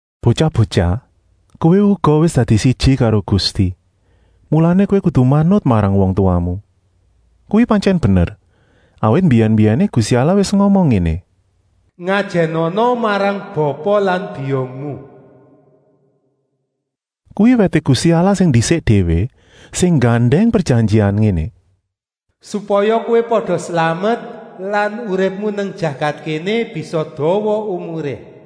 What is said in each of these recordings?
Botyah-botyah, kowé uga wis dadi siji karo Gusti, mulané kowé kudu manut marang wong tuwamu. Kuwi pantyèn bener, awit mbiyèn-mbiyèné Gusti Allah wis ngomong ngéné: “Ngajènana marang bapa lan biyungmu.” Kuwi wèté Gusti Allah sing ndisik déwé sing nggandèng prejanjian ngéné: “Supaya kowé pada slamet lan uripmu nang jagat kéné bisa dawa umuré.”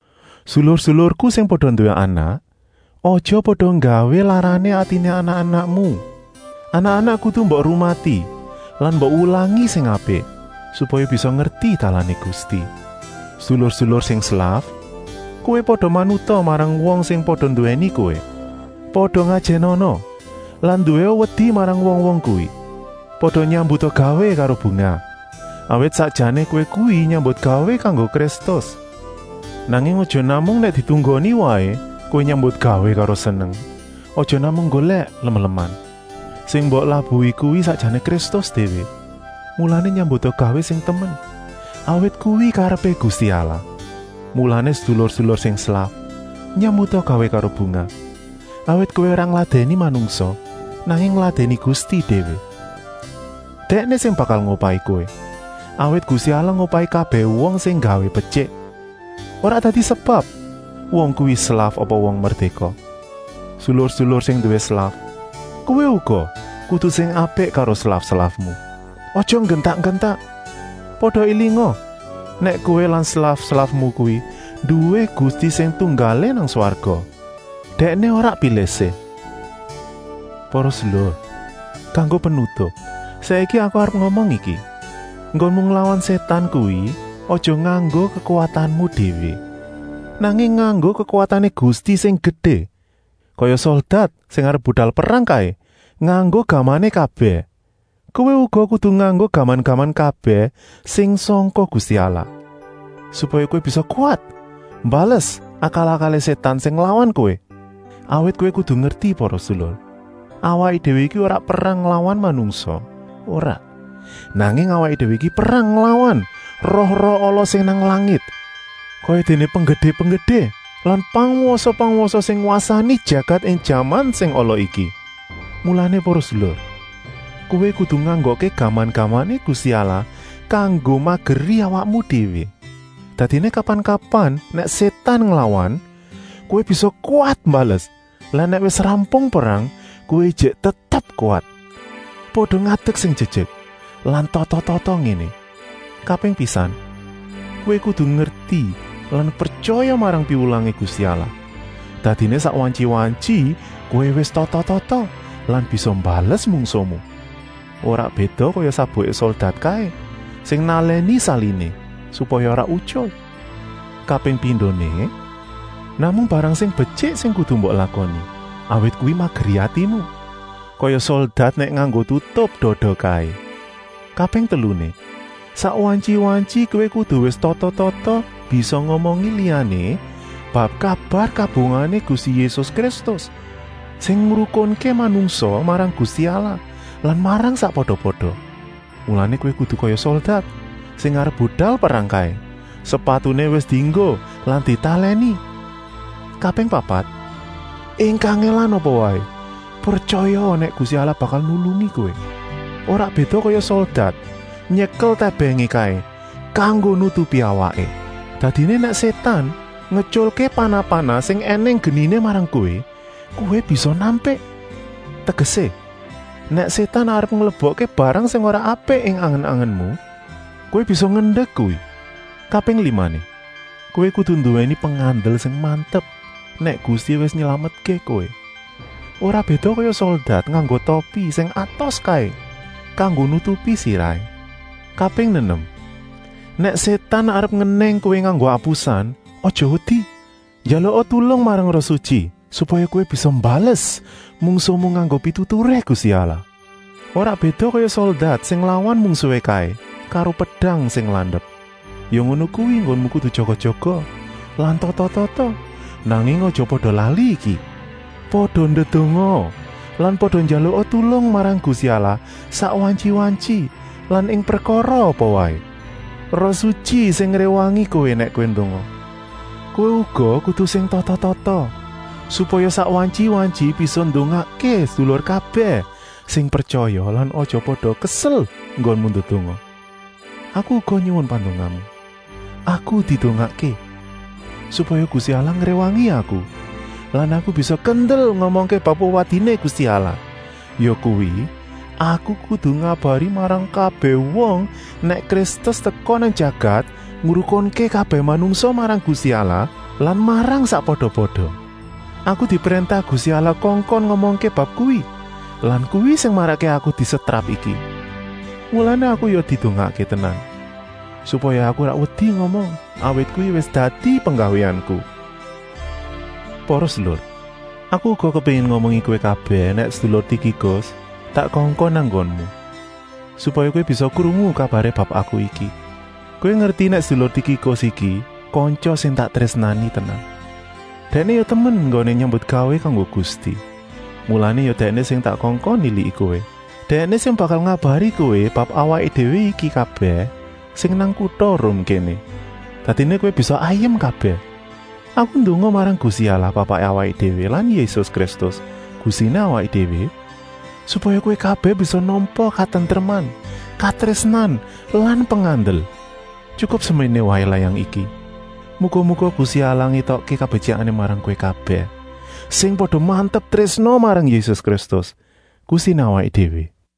Sedulur-sedulurku sing pada nduwé anak, aja pada nggawé larané atiné anak-anakmu. Anak-anak kudu mbok rumati lan mbok wulangi sing apik, supaya bisa ngerti dalané Gusti. Sedulur-sedulur sing slaf, kowé pada manuta marang wong sing pada nduwèni kowé. Pada ngajènana lan nduwéa wedi marang wong-wong kuwi. Pada nyambuta gawé karo bungah, awit sakjané kowé kuwi nyambutgawé kanggo Kristus. Nanging aja namung nèk ditunggoni waé kowé nyambutgawé karo seneng, aja namung nggolèk lem-leman. Sing mbok labuhi kuwi sakjané Kristus déwé, mulané nyambuta gawé sing temen, awit kuwi karepé Gusti Allah. Mulané sedulur-sedulur sing slaf, nyambuta gawé karo bungah, awit kowé ora ngladèni manungsa, nanging ngladèni Gusti déwé. Dèkné sing bakal ngupahi kowé, awit Gusti Allah ngupahi kabèh wong sing nggawé betyik, ora dadi sebab wong kuwi slaf apa wong merdéka. Sedulur-sedulur sing nduwé slaf, kowé uga kudu sing apik karo slaf-slafmu. Aja digentak-gentak. Pada élinga nèk kowé lan slaf-slafmu kuwi nduwé Gusti sing tunggalé nang swarga. Dèkné ora pilih-sih. Para sedulur, kanggo penutup, saiki aku arep ngomong iki: Enggonmu nglawan Sétan kuwi aja nganggo kekuwatanmu déwé, nanging nganggo kekuwatané Gusti sing gedé. Kaya soldat sing arep budal perang kaé nganggo gamané kabèh, kowé uga kudu nganggo gaman-gaman kabèh sing sangka Gusti Allah, supaya kowé bisa kuwat mbales akal-akalé Sétan sing nglawan kowé. Awit kowé kudu ngerti para sedulur. Awaké déwé iki ora perang nglawan manungsa, ora, nanging awaké déwé iki perang nglawan roh-roh ala sing nang langit, kayadéné penggedé-penggedé lan pangwasa-pangwasa sing ngwasani jagat ing jaman sing ala iki. Mulané para sedulur, kowé kudu nganggokké gaman-gamané Gusti Allah kanggo mageri awakmu déwé. Dadiné kapan-kapan nèk Sétan nglawan, kowé bisa kuwat mbales lan nèk wis rampung perang, kowé ijik tetep kuwat. Pada ngadek sing jejek lan tata-tata ngéné! Kaping pisan: kowé kudu ngerti lan pretyaya marang piwulangé Gusti Allah, dadiné sak wantyi-wantyi kowé wis tata-tata lan bisa mbales mungsuhmu. Ora béda kaya sabuké soldat kaé sing nalèni saliné, supaya ora utyul. Kaping pindoné: namung barang sing betyik sing kudu mbok lakoni, awit kuwi mageri atimu, kaya soldat nèk nganggo tutup dada kaé. Kaping teluné: sak wantyi-wantyi kowé kudu wis tata-tata bisa ngomongi liyané bab kabar kabungahané Gusti Yésus Kristus, sing ngrukunké manungsa marang Gusti Allah lan marang sakpada-pada. Mulané kowé kudu kaya soldat sing arep budal perang kaé, sepatuné wis dienggo lan ditalèni. Kaping papat: ing kangèlan apa waé, pretyayaa nèk Gusti Allah bakal nulungi kowé. Ora béda kaya soldat nyekel tèbèngé kaé kanggo nutupi awaké. Dadiné nèk Sétan ngetyulké panah-panah sing ènèng geniné marang kowé, kowé bisa nampik. Tegesé, nèk Sétan arep nglebokké barang sing ora apik ing angen-angenmu, kowé bisa ngendek kuwi. Kaping limané: kowé kudu nduwèni pengandel sing mantep nèk Gusti wis nylametké kowé, ora béda kaya soldat nganggo topi sing atos kaé kanggo nutupi sirahé. Kaping nenem: nèk Sétan arep ngenèng kowé nganggo apusan, aja wedi, njaluka tulung marang Roh Sutyi, supaya kowé bisa mbales mungsuhmu nganggo pituturé Gusti Allah. Ora béda kaya soldat sing nglawan mungsuhé kaé karo pedang sing landep. Ya ngono kuwi enggonmu kudu jaga-jaga lan tata-tata, nanging aja pada lali iki: pada ndedongaa lan pada njaluka tulung marang Gusti Allah sak wantyi-wantyi lan ing prekara apa waé. Roh Sutyi sing ngréwangi kowé nèk kowé ndonga. Kowé uga kudu sing tata-tata, supaya sak wantyi-wantyi bisa ndongakké sedulur kabèh sing pretyaya lan aja pada kesel enggonmu ndedonga. Aku uga nyuwun pandongamu. Aku didongakké, supaya Gusti Allah ngréwangi aku lan aku bisa kendel ngomongké bab wewadiné Gusti Allah, yakuwi, aku kudu ngabari marang kabèh wong nèk Kristus teka nang jagat ngrukunké kabèh manungsa marang Gusti Allah lan marang sakpada-pada. Aku dipréntah Gusti Allah kongkon ngomongké bab kuwi lan kuwi sing marakké aku disetrap iki. Mulané aku ya didongakké tenan, supaya aku ora wedi ngomong, awit kuwi wis dadi penggawéanku. Para sedulur, aku uga kepéngin ngomongi kowé kabèh nèk sedulur Tikikus tak kongkon nang nggonmu, supaya kowé bisa krungu kabaré bab aku iki. Kowé ngerti nèk sedulur Tikikus iki kantya sing tak trésnani tenan. Dèkné ya temen enggoné nyambutgawé kanggo Gusti. Mulané ya dèkné sing tak kongkon niliki kowé. Dèkné sing bakal ngabari kowé bab awaké déwé iki kabèh sing nang kuta Rum kéné. Dadiné kowé bisa ayem kabèh. Aku ndonga marang Gusti Allah Bapaké awaké déwé lan Yésus Kristus, Gustiné awaké déwé, supaya kowé kabèh bisa nampa katentreman, katrésnan lan pengandel. Tyukup seméné waé layang iki. Muga-muga Gusti Allah ngétokké kabetyikané marang kowé kabèh, sing pada mantep trésna marang Yésus Kristus, Gustiné awaké déwé. Paulus